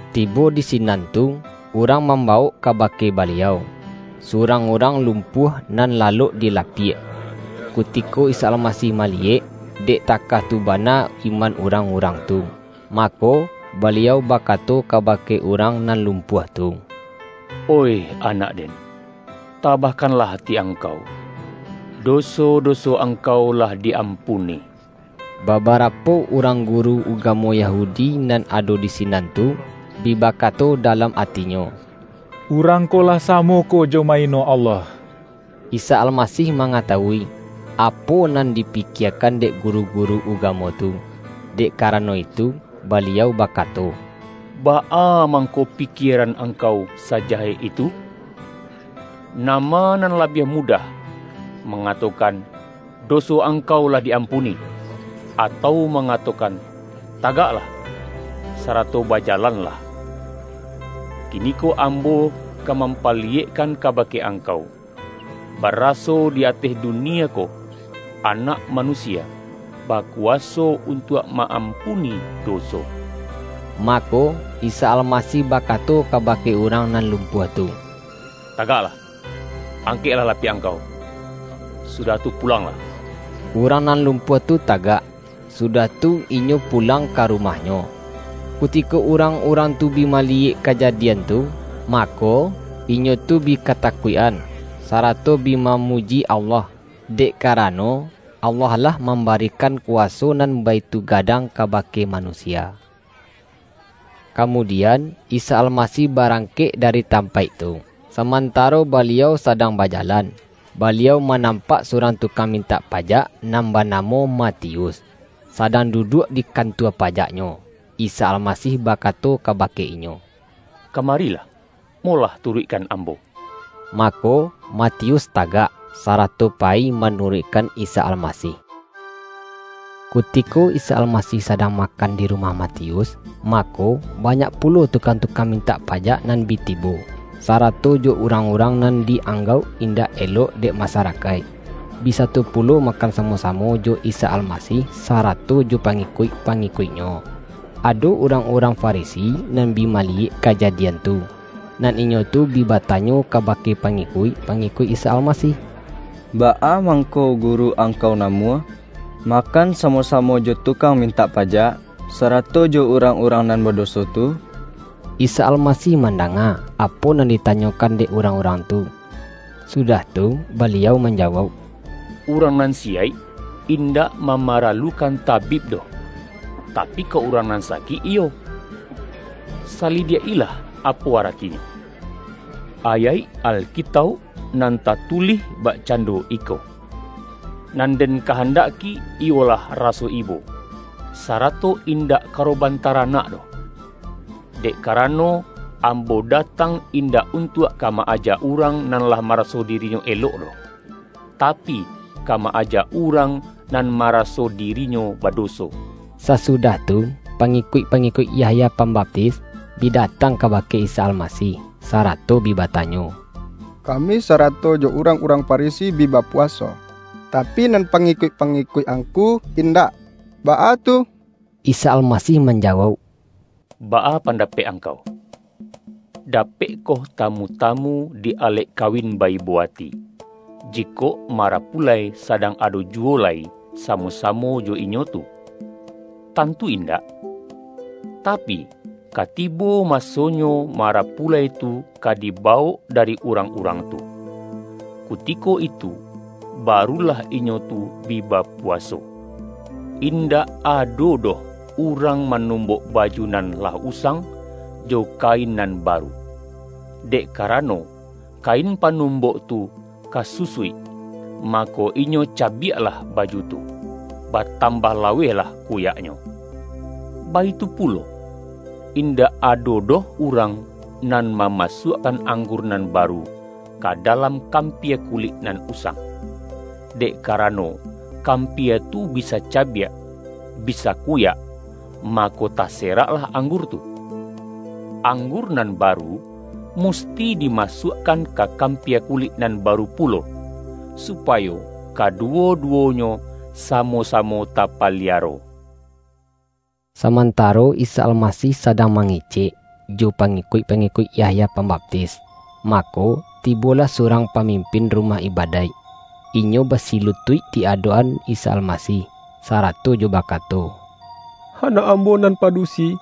Tibo di sinan tu, urang mambawok kabake Baliau, surang urang lumpuah nan lalok di lapiak. Kutiko Isa Almasih maliyek, dek takah tu bana iman urang-urang tu, mako, Baliau bakato kabake urang nan lumpuah tu,”Oih anak-Den, tabahkanlah ati angkau! Doso-doso angkau lah di-ampuni.” Babarapo urang guru ugamo Yahu-di nan ado di sinan tu, bi bakato da-lam atinyo,”Urang ko lah samo ko jo ma-ino Allah!” Isa Almasih mangatawui, apo nan dipikiekan dek guru-guru ugamo tu, dek karano itu, Baliau bakato,”Baa mangko pikieran angkau sajahek itu? Nama nan labiah mudah: mangato-kan, ’Doso angkau lah di-ampuni’, atau mangatokan, ’Tagaklah, sarato baja-lanlah'? Kiniko Ambo ka mampali-yekkan kabake angkau, baraso di ateh dunia ko, Anak Manusia bakuwaso untuak ma-ampuni doso.” Mako, Isa Almasih bakato kabake urang nan lum-puah tu,”Tagaklah, angkeklah lapiak angkau, sudah tu pulanglah!” Urang nan lumpuah tu tagak, sudah tu inyo pulang ka rumahnyo. Kuti-ko urang-urang tu bi maliyek kajadi-an tu, mako, inyo tu bi katakuik-an, sarato bi mamuji Allah, dek karano, Allah lah mambarikan kuwaso nan baitu gadang kabake manusia. Kamudian, Isa Almasih barangkek dari tampaik tu. Samantaro Baliau sa-dang bajalan, Baliau manampak su-rang tukang mintak pajak, nan bana-mo Matius, sadang duduak di kantua pajaknyo. Isa Almasih bakato kaba-ke inyo,”Kamarilah, molah turuik-kan Ambo!” Mako, Matius tagak, sarato payi ma-nuruikkan Isa Almasih. Kutiko Isa Almasih sadang ma-kan di rumah Matius, mako, banyak pulo tukang-tukang mintak pajak nan bi tibo, sarato jo urang-urang nan di-anggauk indak elok dek masarakaik, bi sato pulo makan samo-samo jo Isa Almasih sarato jo pangikuik-pangi-kuik-Nyo. Ado urang-urang Farisi nan bi maliyek kajadian tu. Nan inyo tu bi batanyo kabake pangikuik-pangi-kuik Isa Almasih,”Baa mangko Guru angkau namuah, makan samo-samo jo tukang mintak pajak, sarato jo urang-urang nan badoso tu?” Isa Almasih mandanga, apo nan ditanyokan dek urang-urang tu, sudah tu, Baliau manjawauk,”Urang nan si-yaik indak mamaralukan tabib doh, tapi, kok urang nan sakik iyo. Sali-diak-ilah apo aratinyo, ayaik Alkitauk nan tatulih bakcando iko: ’Nan Den kahandaki iyolah raso ibo, sarato in-dak karoban taranak doh'. Dek ka-rano, Ambo datang indak untuak ka ma-ajak urang, nan lah maraso diri-nyo elok doh, tapi, ka ma-ajak urang nan maraso dirinyo badoso.” Sasudah tu, pangikuik-pangikuik Yahya Pambaptis, bi datang kabake Isa Almasih, sarato bi batanyo,”Ka-mi, sarato jo urang-urang Farisi, bi bapuwaso, tapi, nan pangikuik-pangi-kuik Angku indak, baa tu?” Isa Almasih manjawauk,”Baa pan-dapek angkau? Dapekkoh tamu-tamu di alek kawin ba-ibo ati, jikok mara-pulai sadang ado juwo lai samo-sa-mo jo inyo tu? Tantu indak! Tapi, ka tibo masonyo marapulai tu ka diba-wok dari urang-urang tu. Kutiko itu barulah inyo tu bi bapuwaso. Indak ado doh urang manumbok baju nan lah usang, jo kain nan baru. Dek karano, kain panumbok tu ka su-suik, mako, inyo cabiaklah baju tu, ba-tambah lawehlah kuyaknyo. Baitu pulo, indak ado doh urang nan mama-suakkan anggur nan baru, ka dalam kampia kulik nan usang. Dek karano kampia tu bisa cabiak, bisa kuyak, ma-ko taseraklah anggur tu. Anggur nan baru, musti dimasuakkan ka kampia kulik nan baru pulo, supayo kaduwo-duwonyo samo-samo tapaliaro.” Samantaro Isa Almasih sadang ma-ngecek, jo pangikuik-pangikuik Yahya Pambaptis, mako, tibolah surang pa-mimpin rumah ibadaik. Inyo basilu-tuik di adok-an Isa Almasih, sarato jo bakato,”Anak ambo nan padusi,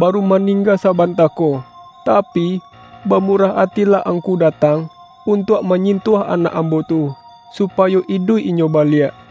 ba-ru maningga sabanta ko. Tapi, bamu-rah atilah Angku datang, untuak ma-nyintuah anak ambo tu, supayo iduik inyo baliak.”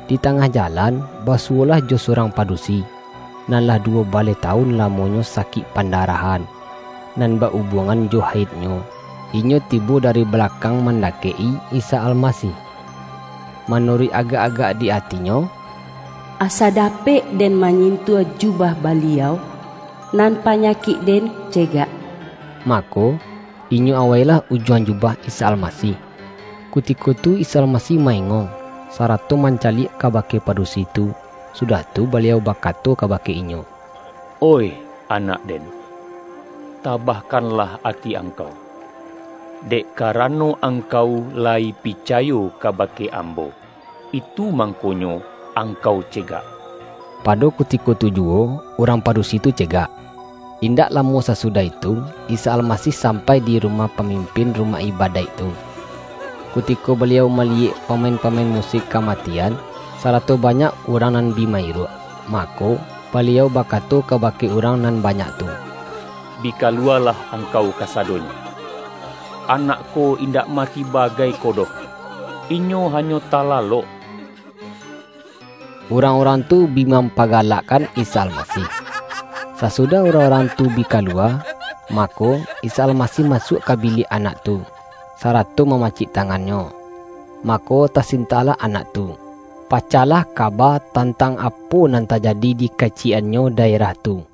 Di tangah jalan, basuwolah jo surang padusi, nan lah duwo baleh tawun lamonyo sakik pandarahan, nan ba-ubuangan jo haidnyo. Inyo tibo dari balakang mandakek-i Isa Almasih. Manuruik agak-agak di ati-nyo,”Asa dapek den manyintuah ju-bah Baliau, nan panyakik den ce-gak.” Mako, inyo awailah ujuang jubah Isa Almasih. Kutiko tu Isa Almasih ma-engong, sarato mancaliak kabake padusi tu, sudah tu Baliau bakato kabake inyo,”Oih anak-Den, ta-bahkanlah ati angkau! Dek kara-no angkau layi picayo kabake Ambo, itu mangkonyo angkau cegak!” Pa-do kutiko tu juwo, urang padusi tu cegak. Indak lamo sasudah itu, Isa Almasih sampai di rumah pamimpin rumah ibadaik tu. Kutiko Baliau maliyek pamain-pamain musik ka-matian, sarato banyak urang nan bi ma-iruak, mako, Baliau ba-kato kabake urang nan banyak tu,”Bi kaluwalah angkau kasadonyo! Anak ko indak mati bagai ko doh; inyo hanyo talalok.” Urang-urang tu bi mampagalak-kan Isa Almasih. Sasudah urang-urang tu bi kaluwa, mako, Isa Al-masih masuak ka biliak anak tu, sarato mamacik tangannyo. Mako tasintaklah anak tu. Pacahlah ka-ba tantang apo nan tajadi dikaci-yek-annyo daerah tu.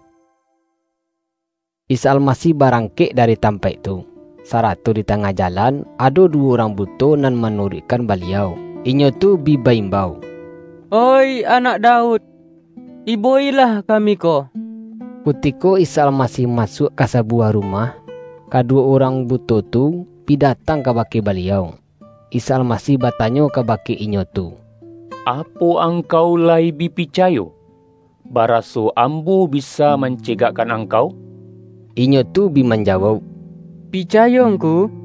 Isa Almasih barangkek dari tam-paik tu, sarato di tangah jalan, ado duwo urang buto nan manuruikkan Baliau. Inyo tu bi ba-imbau,”Oih Anak Daud, ibo-ilah kami ko!” Kutiko Isa Almasih masuak ka sa-buwah rumah, kaduwo urang buto tu bi datang kabake Baliau. Isa Almasih batanyo kabake inyo tu,”Apo angkau layi bi picayo, baraso Ambo bisa man-cegakkan angkau?” Inyo tu bi manjawauk,”Picayo Ngku!”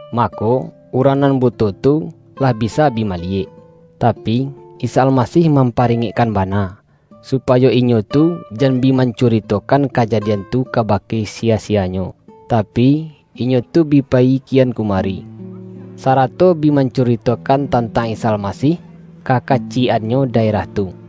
Mako, urang nan buto tu, lah bisa bi maliyek. Tapi, Isa Almasih mampa-ringekkan bana, supayo inyo tu jan bi mancuritokan kajadian tu kabake si-ya-siyanyo. Tapi, inyo tu bi payi kian ku-mari, sarato bi mancuritokan tan-tang Isa Almasih, ka kaciyek-annyo daerah tu.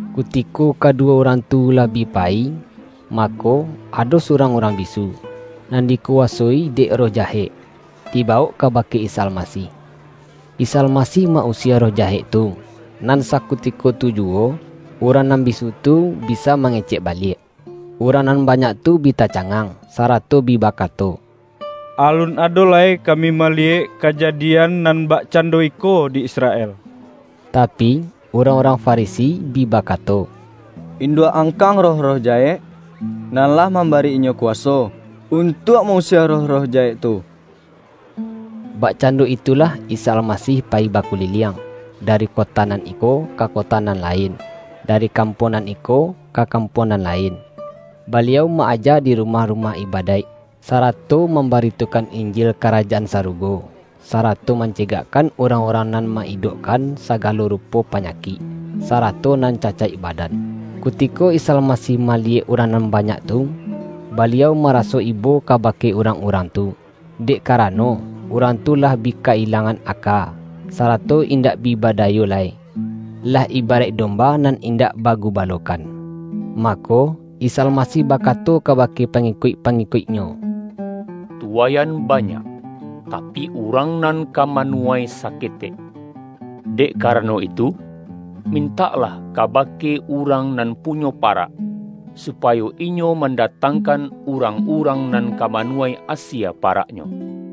Kutiko kaduwo urang tu lah bi payi, mako, ado surang urang bisu, nan dikuwasoi dek roh jahek, di-bawok kabake Isa Almasih. Isa Almasih ma-usie roh jahek tu, nan sakutiko tu juwo, urang nan bisu tu bisa mangecek baliak. Urang nan banyak tu bi tacangang, sarato bi bakato,”Alun ado lai kami mali-yek kajadian nan bakcando iko di Israel!” Tapi, urang-urang Farisi bi ba-kato,”Induak angkang roh-roh ja-hek, nan lah mambari Inyo kuwa-so, untuak ma-usie roh-roh jahek tu.” Bakcando itulah Isa Almasih payi bakuliliang, dari kota nan iko, ka kota nan lain, dari kampuang nan iko, ka kampuang nan lain. Baliau ma-aja di rumah-rumah ibadaik, sarato mam-baritokan Injil Karajaan Sarugo. Sa-rato mancegakkan urang-urang nan ma-idokkan sagalo rupo panyakik, sa-rato nan cacaik badan. Kutiko Isa Almasih maliyek urang nan banyak tu, Baliau maraso ibo kabake urang-urang tu, dek karano, urang tu lah bi ka-ilangan aka, sarato indak bi bada-yo lai, lah ibaraik domba nan indak bagubalokan. Mako, Isa Almasih bakato kabake pangikuik-pangikuik-Nyo,”Tuwaian banyak, tapi, urang nan ka manuwai saketek. Dek ka-rano itu, mintaklah kabake urang nan punyo parak, supayo inyo mandatang-kan, urang-urang nan ka manuwai asie paraknyo.”